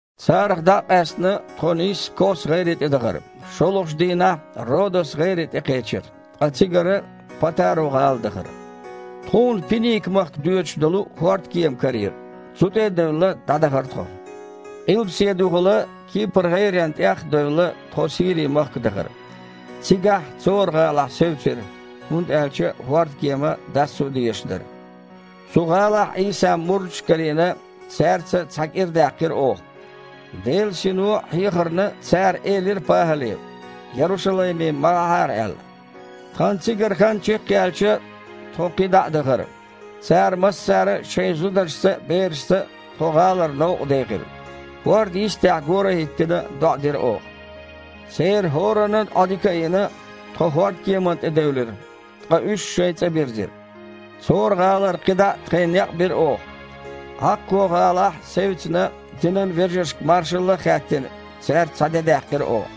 Царах дІа а къаьстина, тхо нийсса Кос-гІайре тІе дахара. ШолгІачу дийнахь Родос-гІайре тІе кхечира, ткъа цигара Патару-гІала дахара. Тхуна Пиника-махка доьдуш долу хІордкема карийра. Цу тІе а девлла, дІадахара тхо. Къилбаседехула Кипр-гІайрена тІех а девлла, тхо Сири-махка дахара. Цигахь Цора-гІалахь севцира, хІунда аьлча хІордкема дассо дезаш дара. Цу гІалахь Іийсан мурдаш а карийна, цаьрца цхьа кІира даьккхира оха. Делан Сино хьехарна цара элира ПахІале, Ярушалайме ма гІахьара аьлла. Тхан цигара хан чекхъяьлча, тхо кхин дІа а дахара. Цара массара а шайн зударшца а, берашца а тхо гІалара новкъа дехира. ХІордан йистехь, гора а хІиттина, доІа дира оха. Церан хІораннан Іодика а йина, тхо хІордкеманна тІе девлира. Ткъа уьш шайн цІа бирзира. Цора-гІалара кхидІа а тхайн некъ бира оха. Іаккхо-гІалахь севцина, динан вежаршка маршалла а хаьттина, цаьрца цхьа де даьккхира оха.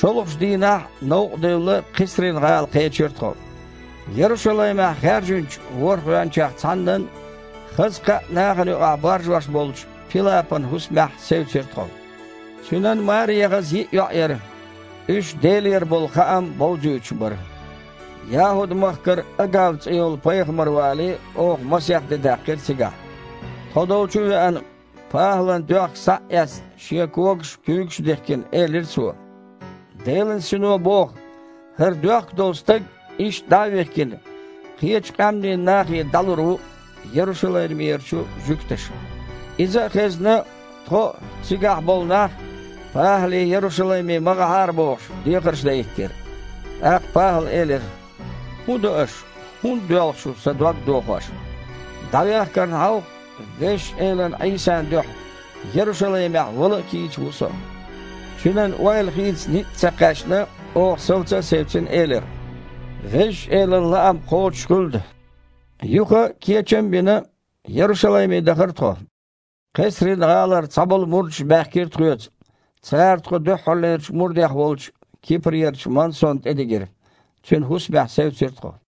ШолгІачу дийнахь новкъа девлла Кхесрин-гІала кхечира тхо. Ярушалаймехь хаьржинчу ворхІ гІоьнчех цхьаннан, хаза кхаъ нахана юкъахь баржош болчу Пилапан хІусамехь севцира тхо. Цуьнан маре яхаза йиъ йоІ яра. Уьш Делера болу хаам бовзуьйтуш бара. ЯхІуд-махкара Агав цІе йолу пайхамар вале, оха масех де даьккхира цигахь. Тхо долчу а веана, ПахІалан доьхка схьа а эцна, шен когаш а, куьйгаш а дихкина, элира цо: «Делан Сино боху: „ХІара доьхка долу стаг, иштта дІа а вихкина, кхечу къаьмнийн нахе дІалур ву Ярушалаймера жуьгташа“». Иза а хезна, тхо а, цигахь болу нах а, ПахІале Ярушалайме ма гІахьара бохуш, дехарш дан хІиттира. ТІаккха ПахІала элира: «ХІун до аша, хІунда доьлху шу, сан дог а дохош? ДІавехкарна хьовха, Везачу Элан Іийсан дуьхьа Ярушалаймехь вала а кийча ву со». Цуьнан ойла хийца ницкъ а ца кхаьчна, оха, совца а севцина, элира: «Везачу Элан лаам кхочушхуьлда». Юха, кечам а бина, Ярушалайме дахара тхо. Кхесрин-гІалара цхьаболу мурдаш баьхкира тхоьца. Цара тхо дуьххьарлерчу мурдех волчу Кипрерачу Мансонна тІе дигира. Цуьнан хІусамехь севцира тхо.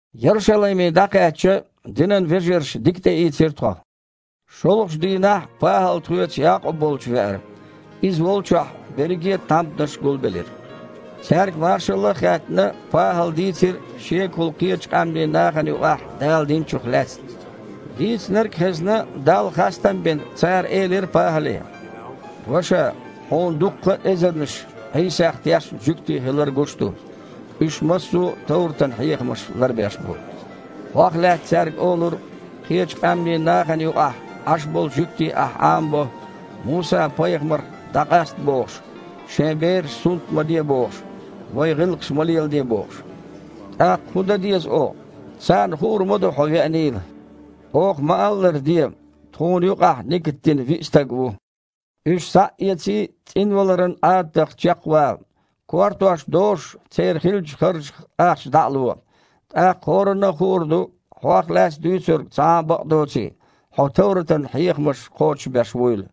Ярушалайме дІакхаьчча, динан вежарша дика тІеийцира тхо. ШолгІачу дийнахь ПахІал тхоьца Якъуб волчу веара. Иза волчохь берриге а тхьамданаш гулбеллера. Цаьрга маршалла а хаьттина, ПахІала дийцира шегахула кхечу къаьмнийн нахана юкъахь Дала динчух лаьцна. Дийцинарг а хезна, Далла хастам а бина, цара элира ПахІале: «Ваша, хьуна дуккха а эзарнаш Іийсах тешна жуьгтий хилар гуш ду. Уьш массо а товратан хьехамаш ларбеш а бу. Хьох лаьцна цаьрга олура, кхечу къаьмнийн нахана юкъахь Іаш болу жуьгтий ахь Іамабо, Муса-пайхамарах дІакъаста бохуш, шайн бераш сунт ма де бохуш, вайн гІиллакхаш ма леладе бохуш. ТІаккха хІун дан деза оха? Царна хуур ма ду хьо веанийла. Оха ма-аллара де: тхуна юкъахь нигат дина виъ стаг ву. Уьш схьа а эций, цІинваларан Іадатах чекхвала. Кортош дошуш церан хиллачу харжах ахча дІа а ло. ТІаккха хІоранна а хуур ду, хьох лаьцна дуьйцург цхьа а бакъ доций, хьо товратан хьехамаш кхочушбеш вуйла.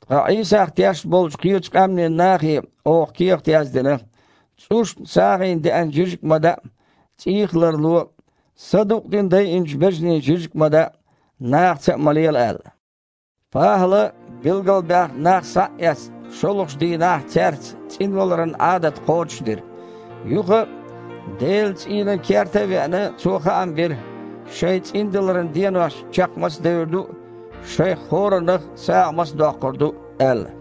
Ткъа Іийсах тешна болчу кхечу къаьмнийн нахе оха кехат яздина, цІушна сагІина деана жижиг а ма даа, цІийх а ларло, садукъдина дайинчу бежанийн жижиг а ма даа, нахаца а ма лела аьлла». ПахІала, билгалбаьхна нах схьа а эцна, шолгІачу дийнахь цаьрца цІинваларан Іадат кхочушдира. Юха, Делан цІийнан керта а веана, цо хаам бира, шайн цІиндаларан денош чекх маца девр ду а, шайх хІораннах а сагІа маца доккхур ду а аьлла.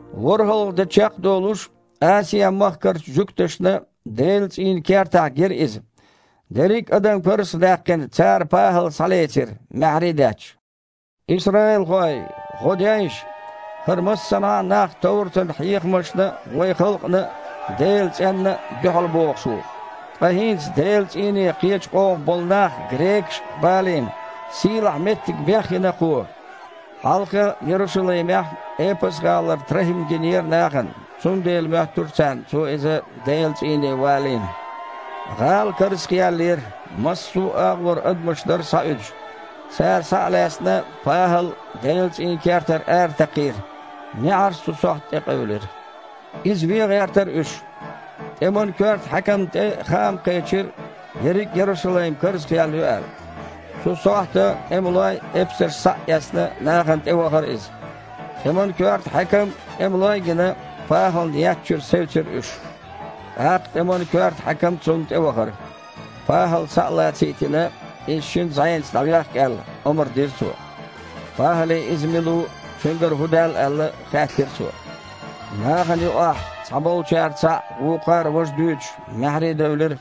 ВорхІалгІа де чекхдолуш Асиа-махкарчу жуьгташна Делан цІийнан кертахь гира иза. Дерриг а адам карзах а даьккхина, цара ПахІал схьалецира, маьхьарий а детташ: «Исраилхой! ГІо дейша! ХІара массанхьа а нах товратан хьехамашна а, вайн халкъана а, Делан цІенна а дуьхьалбохуш ву. Ткъа хІинца, Делан цІийне кхечу къомах болу нах – грекаш – а балийна, сийлахьа меттиг бехйина кхо». (Хьалха, Ярушалаймехь, Эпас-гІалара ТрахІим гинера нахана, цундела моьттура царна цо иза Делан цІийне валийна.) ГІала карзахъяьллера, массо а агІора адамаш дара схьауьдуш. Цара, схьа а лаьцна, ПахІал Делан цІийнан кертара аратакхийра. НеІарш цу сохьта тІекъевлира. Иза вен гІертара уьш. ТІеман коьрта хьаькамна тІе хаам кхечира, ерриг а Ярушалайм карзахъяьлла ю аьлла. Цу сохьта тІемалой а, эпсарш а схьа а эцна, нахана тІевахара иза. ТІеман коьрта хьаькам а, тІемалой а гина, ПахІална еттачуьра севцира уьш. ТІаккха тІеман коьрта хьаькам цунна тІевахара. ПахІал схьа а лацийтина, иза шина зІенаца дІавехка аьлла, омра дира цо. ПахІале иза мила ву, цуьнгара хІун даьлла аьлла, хаьттира цо. Нахана юкъахь, цхьаболчара цхьаъ, вукхара важа дуьйцуш, маьхьарий девлира.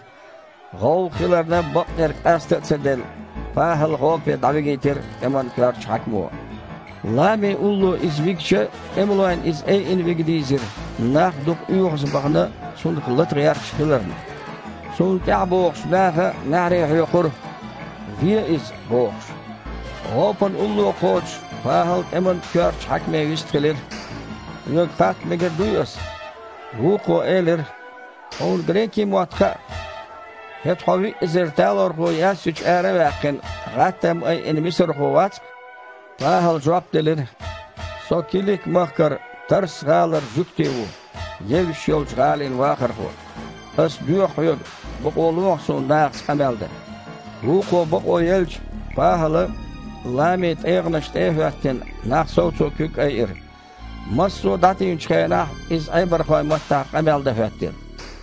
ГІовгІа хиларна бакъдерг къаста а ца делла, ПахІал гІопе дІавигийтира тІеман коьртачу хьаькамо. Лами улло иза вигича, тІемалойн иза айина вига дийзира, нах дукха оьгІазбахана, цунах лата гІерташ хиларна. Цунна тІаьхьабогІучу наха маьхьарий хьоькхура: «Ве иза!» – бохуш. ГІопана улло кхочуш, ПахІал тІеман коьртачу хьаькаме вистхилира: «Хьоьга хатта мегар дуй ас?» Вукхо элира: «Хьуна грекийн мотт хаьа? ХІета, хьо виъ эзар талорхо яьссачу ара а ваьккхина, гІаттам айина мисархо вац-кх?» ПахІала жоп делира: «Со Килик-махкара Тарс-гІалара жуьгти ву, евзаш йолчу гІалин вахархо. Ас доьху хьоьга, бакъо лохьа суна нахаца къамел дан». Вукхо бакъо елча, ПахІала, ламин тІегІанаш тІе а хІоьттина, нах совцо куьг айира. Массо а дІатийначу хенахь иза Іебархойн маттахь къамел дан хІоьттира.